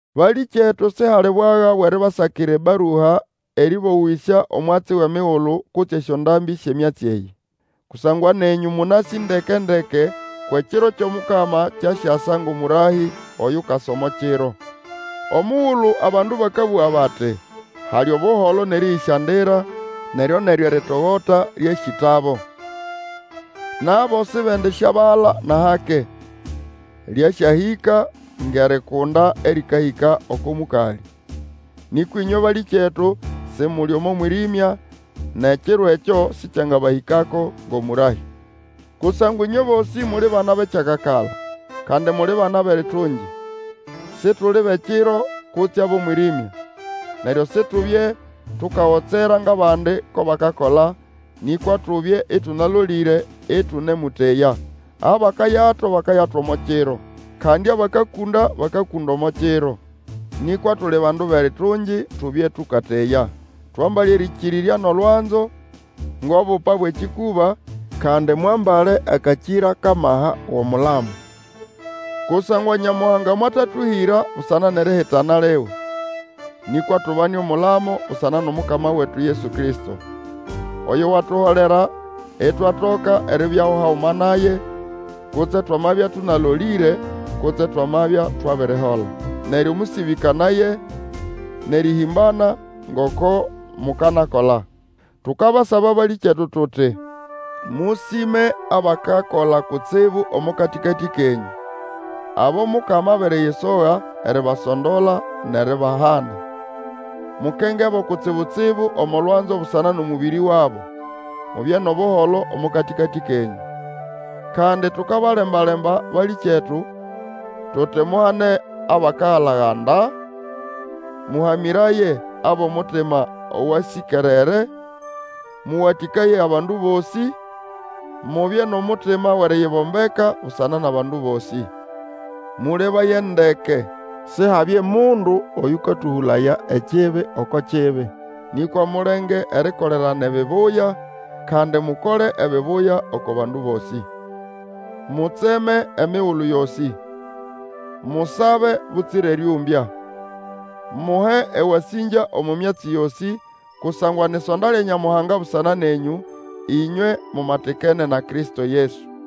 Balĩkyetu, sihali bwaga bwʼeribasakira ebarua erĩbowĩsya omwatsi wʼemigulu kutse esyondambĩ syʼemyatsi eyĩ. Kusangwa nenyũ mũnasĩ ndeke-ndeke kwʼekiro kyʼomukama kyasyasa ngʼomũrahĩ oyukasa omo kiro. Omugulu abandu bakabũga bati, Hali Obuholo nʼerĩyĩsyandira, neryo-neryo eritogota lyasyĩtabo! Nabo sibendisyabala nʼahake, lyasyahĩka ngʼerikunda erĩkahĩka oko mũkalĩ. Nĩkwa ĩnywe balĩkyetu, Simuli omo mwĩrĩmya, nʼekiro ekyo sĩkyangabahĩkako ngʼomũrahĩ. Kusangwa ĩnywe bosĩ muli bana bʼekyakakala, kandi muli bana bʼeritungi. Situli bʼekiro kutse abʼomwĩrĩmya. Neryo situbye tukagotsera ngʼabandi ko bakakola; nĩkwa tubye ĩtũnalolĩre ĩtũnemũteya. Abakayato bakayato omo kiro, kandi abakakũnda bakakũnda omo kiro. Nĩkwa tuli bandu bʼeritungi, tubye tũkateya. Twambale erĩkĩrĩrya nʼolwanzo ngʼobupa bwʼekĩkũba, kandi mwambale akakĩra kʼamaha wʼomulamo. Kusangwa Nyamuhanga mwatatũhĩra busana nʼerihitana liwe, nĩkwa tubane omulamo busana nʼOmukama wetu Yesu Kristo, Oyo watuholera itwatoka eribyaho haguma naye, kutse twamabya tũnalolĩre kutse twamabya twabirihola. Neryo mũsĩbĩkanaye, nʼerihĩmbana, ngoko mukanakola. Tukabasaba, balĩkyetu, tuti mũsĩme abakakola kutsibu omo katĩkatĩ kenyũ, abo Mukama abiriyisoga eribasondola nʼeribahana. Mukengebo kutsibu-tsibu omo lwanzo busana nʼomũbĩrĩ wabo, Mubye nʼobuholo omo katĩkatĩ kenyũ. Kandi tukabalemba-lemba, balĩkyetu, tuti muhane abakagala-ganda, mũhamĩraye abʼomutima owasĩkerere, mũwatĩkaye abandu bosĩ, mubye nʼomutima wʼeriyibombeka busana nʼabandu bosĩ. Mũlebaye ndeke Sihabye mundu Oyũkatũhũlaya ekibi oko kibi, nĩkwa mulenge erikolerana ebibuya, kandi mukole ebibuya oko bandu bosĩ. Mutseme emigulu yosĩ. Musabe butsira erĩũmbya. Muhe ewasĩngya omo myatsi yosĩ; kusangwa ni ʼsonda lya Nyamuhanga busana nenyũ, ĩnywe mumatikene na Kristo Yesu.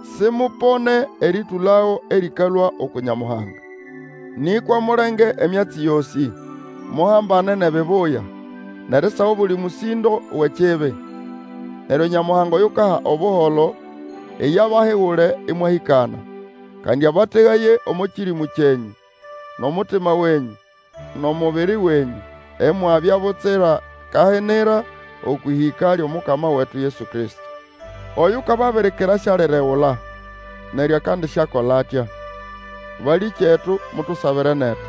Simupone erĩtũlago erĩkalũa uku Nyamuhanga. Nĩkwa mulenge emyatsi yosĩ; muhambane nʼebibuya, nʼerisaga obuli mũsĩndo wʼekibi. Neryo Nyamuhanga oyukaha Obuholo, iye abahigule ĩmwahĩkana. Kandi abategaye omo kĩrĩmũ kyenyũ, nʼomutima wenyũ, nʼomubiri wenyũ, imwabya butsira kahinira okwʼĩhĩka lyʼomukama wetu Yesu Kristo. Oyukababirikira sialiregula, neryo akandisyakola atya. Balĩkyetu, mutusabire netu.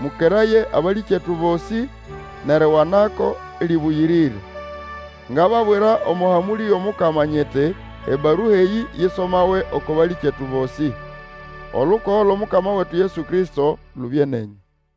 Mũkeraye abalĩkyetu bosĩ, nʼeriwanako lĩbũyĩrĩre. Ngababwira omo hamũlĩ yʼomukama, nyiti, ebarua eyĩ isomawe oko balĩkyetu bosĩ. Olukogo lwʼOmukama wetu Yesu Kristo lubye nenyũ.